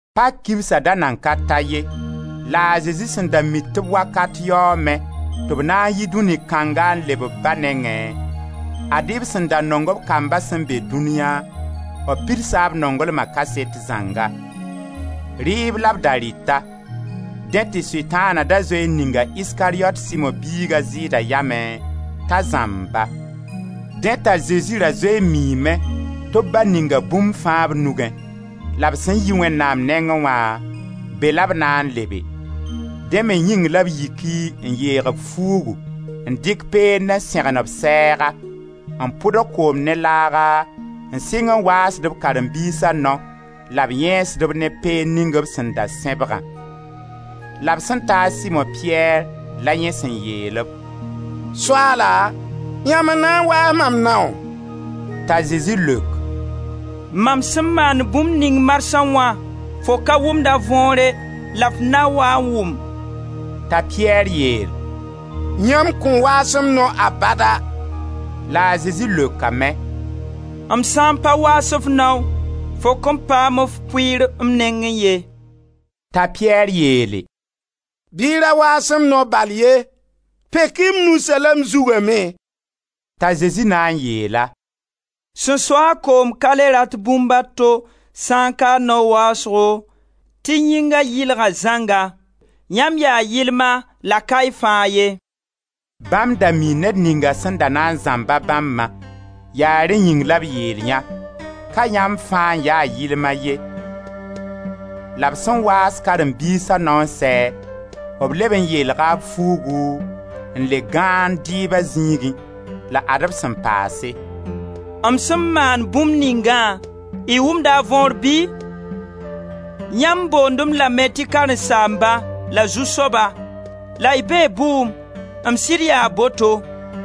Pak kibsa da nan ka ta ye, la a Zezi sẽn da mi tɩ b wakat yaoome, tɩ b na n yi dũni kãnga n leb b Ba nengẽ, ad-y b sẽn da nong b kamba sẽn be dũniya, b pidsa b nonglma kaset zãnga. Rɩɩb la b da rɩta. Dẽ tɩ Sʋtãana da zoe n ninga Iskariyot Simo biig a Zɩɩda yamẽ, t'a zãmb-ba. Dẽ t'a Zezi ra zoe n miime tɩ b Ba ninga bũmb fãa b nugẽ, la b sẽn yi Wẽnnaam nengẽ wã, be la b na n lebe. Dẽ me yĩng la b yiki n yeeg b fuugu n dɩk peend n sẽgen b sɛɛga, n pʋdg koom ne laaga n sɩng n waasd b karen-biisa nao, la b yẽesd-b ne peend ning b sẽn da sẽbgã. La b sẽn ta a Simo-Piyɛr la yẽ sẽn yeel-b: «Soaala, yãmb n na n waas mam naoo?» T'a Zezi leok: «Mam sẽn maand bũmb ning marsã wã, fo ka wʋmda võore la f na waa n wʋm.» T'a Piyɛr yeel: «Yãmb kõn waas m nao abada!» La a Zezi leokame: «M sã n pa waas f nao, fo kõn paam f pʋɩɩr m nengẽ ye.» T'a Piyɛr yeele: «Bɩ y ra waas m nao bal ye, pek-y m nusã la m zuga me.» T'a Zezi na n yeel-a: «Sẽn so-a koom ka le rat bũmb a to sa n ka a nao waasgo tɩ yĩnga yɩlga zãnga. Yãmb yaa yɩlma la ka y fãa ye.» Bãmb da mii ned ninga sẽn na n zãmba bãmbã, yaa rẽ yĩng la yeel yã: ka yãmb fãa n ya yɩlm ye. La b sẽn waas karen-biisa nao n sɛ, b leb n yeelga b fuugu n le gãand dɩɩba zĩigẽ la ad-b sẽn paase: «M sẽn maan bũmb ningã, y wʋmda a võor bɩ? Yãmb boond-m lame tɩ karen-saamba la Zu-soaba, la y bee bʋʋm, m sɩd yaa boto.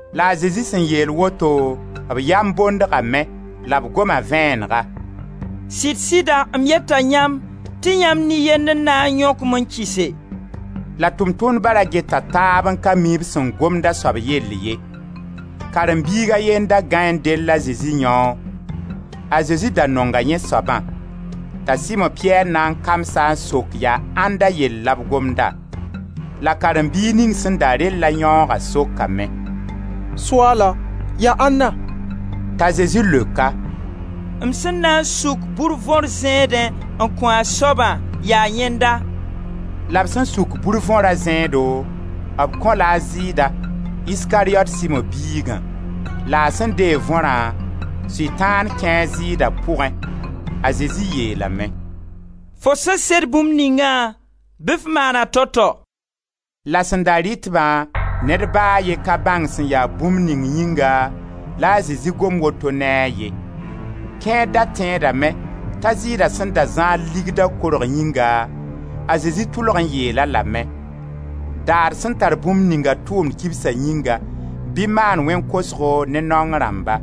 La a Zezi sẽn yeel woto, b yam bondgame, la b goma vẽenega: «Sɩd-sɩda m yeta yãmb tɩ yãmb nin-yend n na n yõk-m n kɩse.» La b tʋʋm-tʋmdba ra geta taab n ka mi b sẽn gomd a soab yell ye. Karen-biig a ye n da gãe n dell a Zezi yãoog. A Zezi da nonga yẽ soabã. T'a Simo-Piyɛr na n kams-a n sok yaa ãnda yell la b gomda. La karen-biig ning sẽn da rella yãoogã sokame: «Soaala, yaa ãnna?» T'a Zezi leok-a: «M sẽn na suk bur võr zẽedẽ n kõ a soabã, yaa yẽnda.» La b sẽn suk bur võra zẽedo, b kõ-la a Zɩɩda, Iskariyot Simo biigã. La a sẽn deeg võrã, Sʋtãan kẽe a Zɩɩda pʋgẽ; a Zezi yeelame: «Fo sẽn sed bũmb ningã, bɩ f maan-a tao tao.» La sẽn da rɩt-bã ned ba a ye ka bãng sẽn ya bũmb ning yĩnga la a Zezi gom woto ne a ye. Kẽer da tẽedame t'a Zɩɩda sẽn da zãad ligda korg yĩnga, a Zezi tʋlg n yeel-a lame: «Da d sẽn tar bũmb ninga tʋʋmd kibsa yĩnga, bɩ maan wẽn kosgo ne naong rãmba.»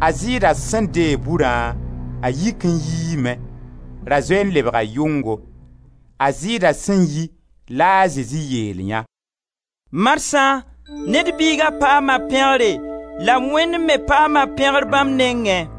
A Zɩɩda sẽn deeg burã, a yik n yiime; ra zoe n lebga yʋngo. A Zɩɩda sẽn yi la a Zezi yeel yã: «Marsã Ned Biiga paama pẽgre la Wẽnd me paama pẽgr bãmb nengẽ.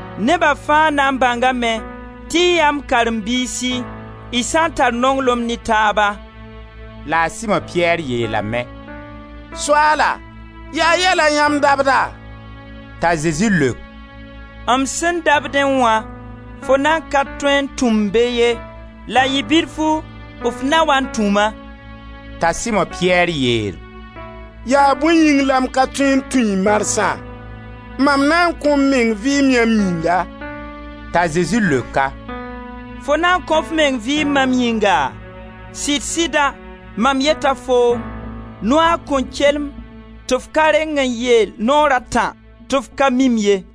Neba fãa na n bãngame tɩ y yaa m karen-biisi: y sã n tar nonglem ne taaba.» La a Simo-Piyɛr yeelame: «Soaala, yaa yɛ la yãmb dabda?» T'a Zezi leok: «M sẽn dabdẽ wã, fo nan ka tõe n tũ-m be ye, la yɩ bilfu f na waa n tũ-ma.» T'a Simo-Piyɛr yeel: «Yaa bõe yĩng la m ka tõe n tũ-y marsã? Mam na n kõ m meng vɩɩm yãmb yĩnga.» T'a Zezi leok-a: «Fo na n kõo f meng vɩɩm mam yĩnga? Sɩd-sɩda mam yeta foom: noaag kõn kelem tɩ f ka reng n yeel naoor a tã tɩ f ka mi-m ye.